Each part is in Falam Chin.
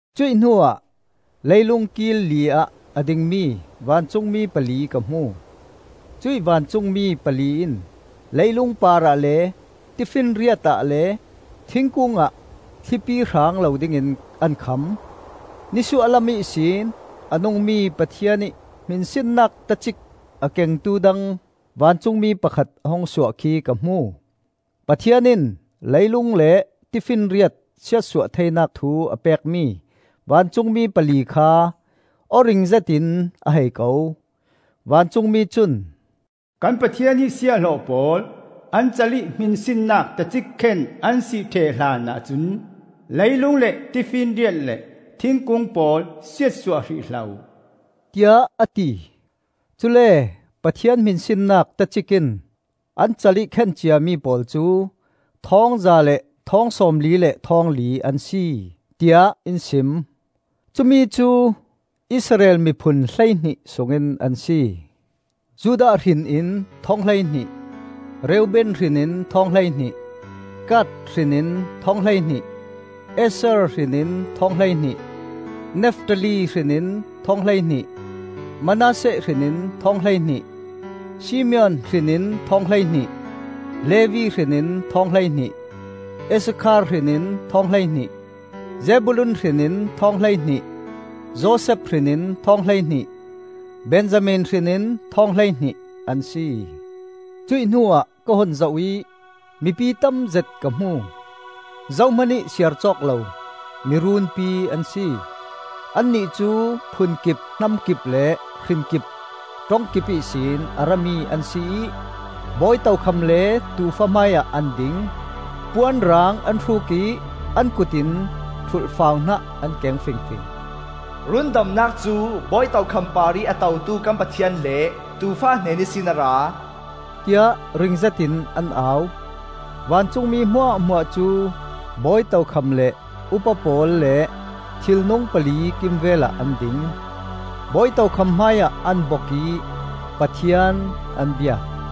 Cuih hnuah leilung kil li ah a dingmi vancungmi pali ka hmu. Cuih vancungmi pali in leilung parah le tifinriat ah le thingkung ah thlipi hrang lo dingin an kham. Nisuah lam ihsin a nungmi Pathian ih hminsinnak tacik a kengtu dang vancungmi pakhat a hung suah khi ka hmu. Pathian in leilung le tifinriat siatsuah theinak thu a pekmi vancungmi pali kha aw ring zetin a hei ko. Vancungmi cun, “Kan Pathian ih siahhlawh pawl an cal ih hminsinnak tacik khen an si ṭheh hlan ahcun leilung le tifinriat le thingkung pawl siatsuah hrih hlah uh,” tiah a ti. Cule Pathian hminsinnak tacik in an cal ih khen ciami pawl cu thawng za le thawng sawmli le thawng li an si, tiah in sim. Cumi cu Israel miphun hleihnih sungin an si. Judah hrin in thawng hleihnih, Reuben hrin in thawng hleihnih, Gad hrin in thawng hleihnih, Asher hrin in thawng hleihnih, Naftali hrin in thawng hleihnih, Manasseh hrin in thawng hleihnih, Simeon hrin in thawng hleihnih, Levi hrin in thawng hleihnih, Issakhar hrin in thawng hleihnih, Zebulun hrin in thawng hleihnih, Josef hrin in thawng hleihnih, Benjamin hrin in thawng hleihnih an si. Cuih hnuah ka hun zoh ih mipi tamzet ka hmu; zohmanih siarcawk lo miruunpi an si. Annih cu phun kip, hnam kip, le hrin kip ṭong kip ihsin a rami an si ih bawi tokham le Tuufa hmaiah an ding; puan rang an hruk ih an kut in ṭhulhfau hnah an keng fingfing. “Rundamnak cu bawi tokham parih a totu kan Pathian le Tuufa hnen ihsin a ra,” tiah ring zetin an au. Vancungmi hmuahhmuah cu bawi tokham le upa pawl le thilnung pali kimvelah an ding. Bawi tokham hmaiah an bok ih Pathian an biak;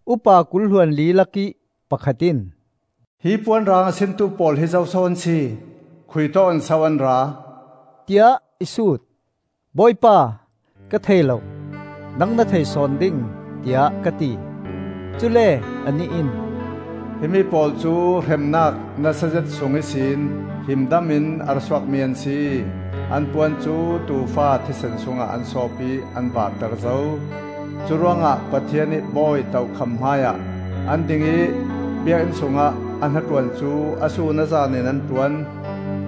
Upa kul hluanli lakih pakhat in, “Hi puan rang a sintu pawl hi zoso an si? Khuitawk in so an ra?” tiah i sut. “Bawipa, ka thei lo. Nang na thei sawn ding,” tiah ka ti. Cule anih in, “Himi pawl cu hremnak nasazet sung ihsin himdam in a ra suakmi an si. An puan cu Tuufa thisen sungah an sawp ih an vaar ter zo. Curuangah Pathian ih bawi tokham hmaiah an ding ih biakinn sungah a hnaṭuan cu a sun a zan in an ṭuan.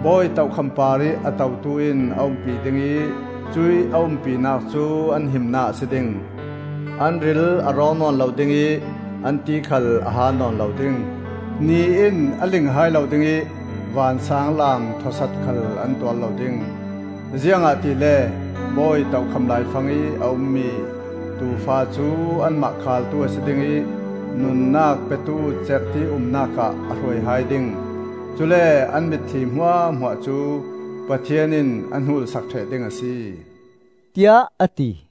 Bawi tokham parih a totu in a umpi ding ih cuih a umpinak cu an himnak a si ding. An ril a rawng nawn lo ding ih an ti khal a haal nawn lo ding; ni in a ling hai lo ding ih vansaanglam thawsat khal an tuar lo ding. Ziangahtile bawi tokham laifangih a ummi Tuufa cu anmah khaaltu a si ding ih nunnak petu cerhti umnak ah a hruai hai ding. Cule an mitthli hmuahhmuah cu Pathian in a hnul sak ṭheh ding a si,” tiah a ti.